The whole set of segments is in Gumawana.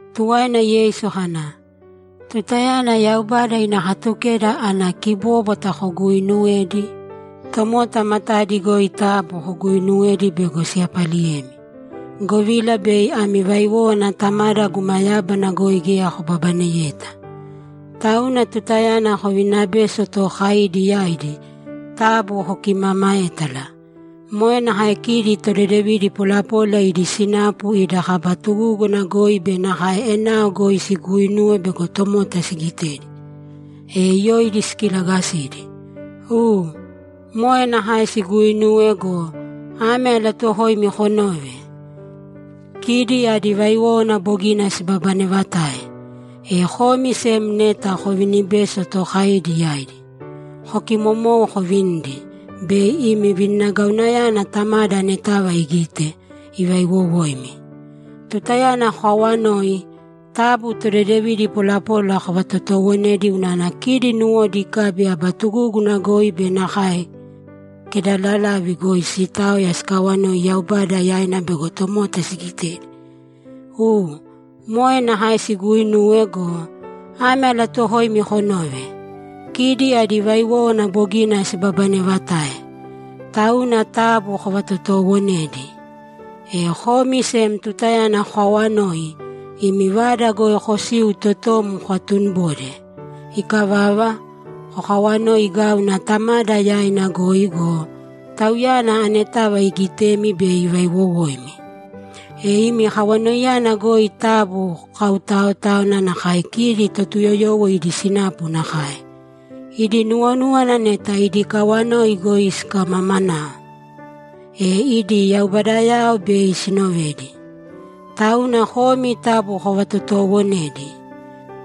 Tuwaina Yeisu kana, ‘Tutayana Yaubada ina Katukeda ana kibóbwata koguuinuwedi, tomota matadi goi taabu koguuinuwēdi bego siyapaliyemi, govila bei ami vaiwówana Tamada guma yábana goi geya kobabaneyeta. Tauna tutayana kovininabeso tookaidi yaidi, taabu kokimaamaētala. Moe nakae kidi todedevidi polapola idi sinapu ida kaba tugúguna goi be nakae enao goi siguuinuwe bego tomota sigitedi, e yoidi sikilagasidi. U, moe nakae siguuinuwe go, ame alatuuwokoimi konōve: Kidi adi vaiwówana bogina sibabanevatae. E komi sem neta kovininabeso tookaidi yaidi, kokimomōu kovinīdi bei imi vininagauyana Tamada anetava igite, ivaiwowoimi. Tutayana kokawanoi, taabu todedevidi polapola kovatotoowonēdi unana kidi nuwodi ikabi aba tugúguna goi be nakae kedalalavi goi siitaoya sikawanoi Yaubada yaina bego tomota sigitedi. U, moe nakae siguuinuwe go, ame alatuuwokoimi konōve: Kidi adi vaiwówana bogina sibabanevatae. Tauna taabu kovatotoowonēdi. E komi sem tutayana kokawanoi, imi vada goi kosīu totom kokatunibōde. Ikavava, kokawanoi gāuna Tamada yaina goi go, Tauyana anetava iigitemi bei ivaiwowoimi. E imi kawanoiyana goi taabu kokautaotāwana nakae kidi Totuyoyowo idi sinapu nakae. Idi nuwonúwana neta idi kawanoi goi sikimamanao, e idi yaubadayao bei sinovedi. Tauna komi taabu kovatotoowonēdi.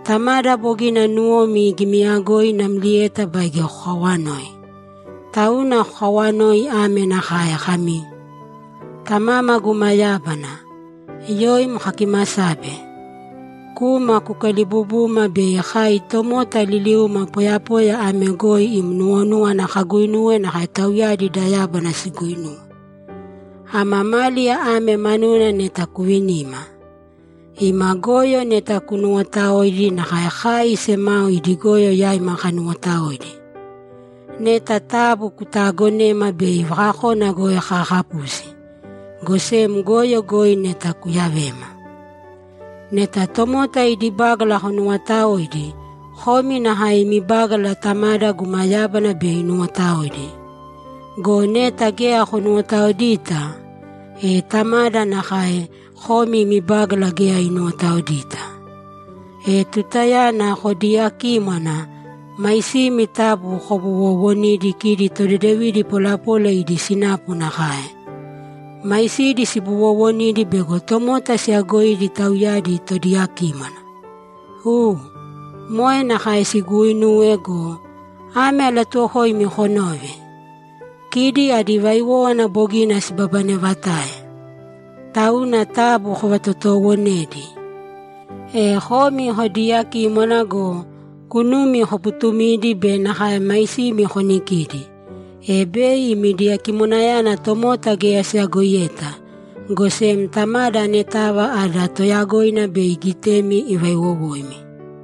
Tamada bogina nuwomi igimiyagoi namlieta baige kokawanoi. Tauna kokawanōi ame nakae kami, “Tamama guma yábana, yoim kakimasabe. Kūma kukalibubūma bei kai tomota liliuma poyapoya ame goi im nuwonúwana kaguinuwe nakae tauyadi da yábana siguuinuwe. Ama máliya ame manuna neta kuvinīma. Ima goyo neta kunuwotaōidi nakae kai semao idi goyo yaima kanuwotaoidi. Neta taabu kutaagonēma bei vakakona goi kaakapusi, go sem goyo goi neta kuyavēma.” Neta tomota idi bágala konuwotaoidi, komi nakae imi bágala Tamada guma yábana bei inuwotaoidi. Go neta geya konuwotaoidita, e Tamada nakae, komi imi bágala geya inuwotaoidita. E tutayana kodiiyakímwana, maisimi taabu kobuwoowonīdi kidi todedevidi polapola idi sinapu nakae. Maisidi sibuwowonidi bego tomota siyagoidi tauyadi todiyakímwana. U, moe nakae siguuinuwe go, ame alatuuwokoimi konōve: Kidi adi vaiwówana bogina sibabanevatae. Tauna taabu kovatotoowonēdi. E komi kodiiyakímwana go, kunumi koputumīdi be nakae maisimi konikīdi, e bei imi diyakimwanayana tomota geya siyagoiyeta, go sem Tamada anetava ada toyagoina bei igitemi ivaiwowoimi.’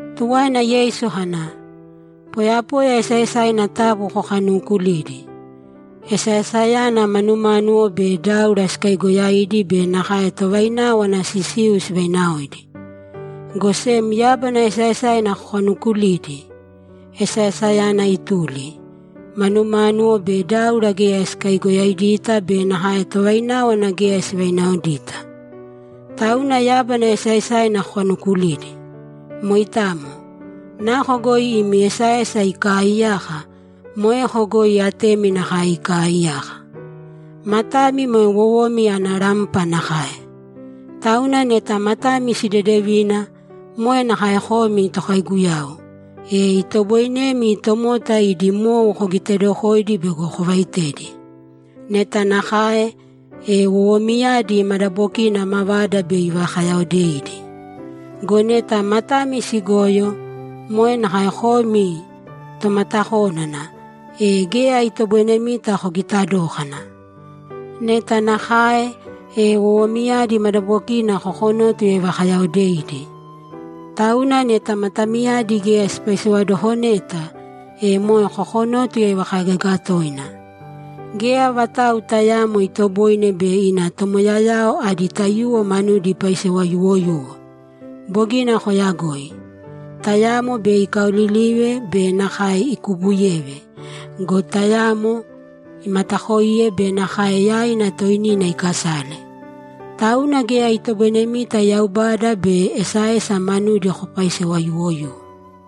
Tuwaina Yeisu kana, ‘Poyapoya esaesaina taabu kokanuukulīdi. Esaesayana manumánuwo be dáura sikaigoyaidi be nakae tovaináwana sisiu sivainaoidi. Go sem yábana esaesaina kokanuukulīdi. Esaesayana ituli. Manumánuwo be dáura geya sikaigoyaidita be nakae tovaináwana geya sivainaoidita. Tauna yábana esaesaina kokanuukulīdi. Moitamo. Nako goi imi esaesa ikaaiyaka, moeko goi atemi nakae ikaaiyaka. Matami moe wowomi ana rampa nakae. Tauna neta matami sidedevina, moe nakae komi tokaiguyau, e itoboinemi tomota idi mou kogitedokoidi bego kovaitedi. Neta nakae, e wowomiyadi madabokina mavada bei ivakayaodeidi. Go neta matami sigoyo, moe nakae komi tomatakónana, e geya itoboinemita kogita dókana. Neta nakae, e wowomiyadi madabokina kokonótuya ivakayaodeidi. Tauna neta matamiyadi geya sipaisewadokoneta, e moe kokonótuya ivakaigaga toina. Geya vatau tayaamo itoboine bei ina tomoyayao adi taiyuwo manudi ipaisewa yuwoyuwo. Bogina koyagoi. Tayamo bei ikaolilive be nakae ikubuyeve go, tayamo imatakoiye be nakae yaina toinina ikasale. Tauna geya itoboinemita Yaubada be esaesa manudi kopaisewa yuwoyuwo.’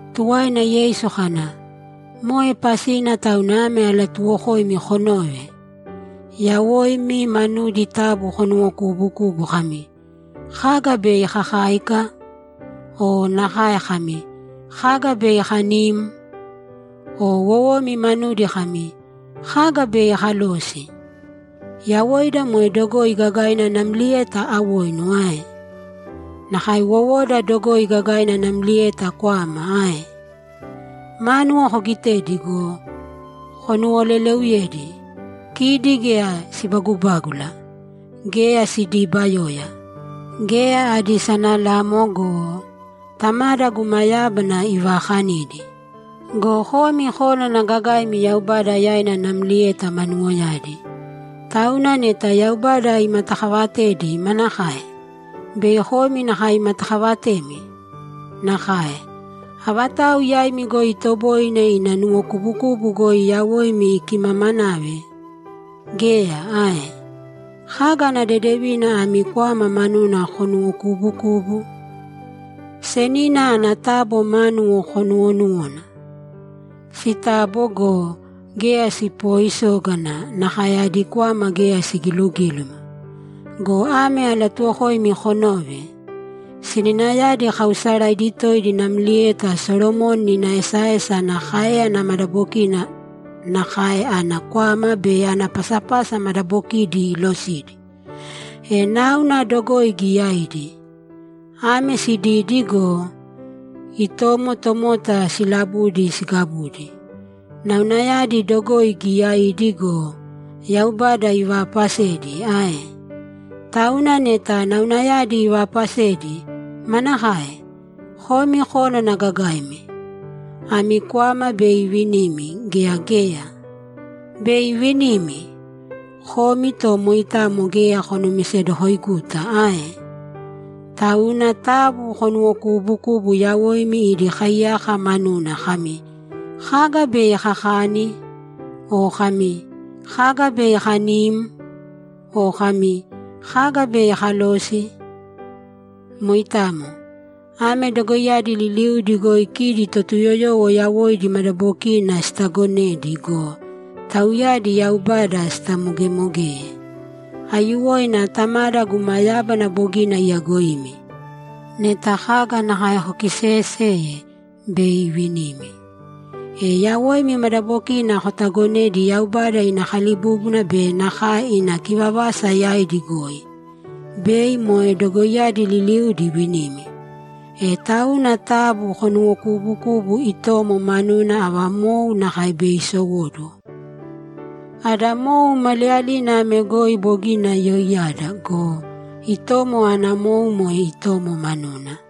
Tuwaina Yeisu kana, ‘Moe pasina tauna ame alatuuwokoimi konōve: Yawoimi manudi taabu konuwokuubukūbu kami, “Kaga bei kakáika?” O nakae kami, “Kaga bei kanim?” O wowomi manudi kami, “Kaga bei kalosi?” Yawoida moe dogoi gagaina namlieta awoinu ae? Nakae wowoda dogoi gagaina namlieta kwama ae? Mánuwo kogitēdi go, konuwoleleuyēdi. Kidi geya sibagubágula. Geya sidiibayoya. Geya adi sanalamo go, Tamada guma yábana ivaakanidi. Go komi kónana gagaimi Yaubada yaina namlieta manuwoyadi. Tauna neta Yaubada imatakaavatedi, manakae? Bei komi nakae imatakavatemi? Nakae. Avatau yaimi goi itoboine ina nuwokubukubu goi yawoina ikimamanave? Geya ae? Kaga ana dedevina ami kwama manuna konuwokubukubu? Senina ana tabo manuna konuwonūwana. Sitabo go, geya sipooisógana, nakae adi kwama geya sigilugíluma. Go ame alatuuwokoimi konōve: Seninayadi kaausaraidi toidi namlieta Solomoni ina esaesa ana káeyana madabokina, nakae ana kwama be ana pasapasa madabokidi iilosidi. E náuna dogoi giyaidi. Ame sididi go, itomo tomota silabudi sigabudi. Naunayadi dogoi giyaidi go, Yaubada ivaapasedi ae? Tauna neta naunayadi ivaapasedi, manakae? Komi kónana gagaimi, ami kwama bei ivinimi gea geya? Bei ivinimi! Komi to moitamo geya konumisedokoiguta ae? Tauna taabu konuwokuubukūbu yawoimi idi kaiyaka manuna kami, “Kaga bei kakani?” O kami, “Kaga bei kanim?” O kami, “Kaga bei kalosi?” Moitamo. Ame dogoiyadi liliudi goi kidi Totuyoyowo yawoidi madabokina sitaagonedi go, tauyadi Yaubada sitamogemogeye. Aiyuwoina Tamada guma yábana bogina iyagoimi. Neta kaga nakae kokiseeyeseye, bei ivinimi. E yawoimi madabokina kotagonēdi Yaubada ina kalibúbuna be nakae ina kivavasa yaidi goi, bei moe dogoiyadi liliudi ivinimi. E tauna taabu konuwokuubukūbu itomo manuna ava mou nakae bei sisowóduwo. Ada mou maliyalina ame goi bogina yoiyada go, itomo ana mou moe itomo manuna.’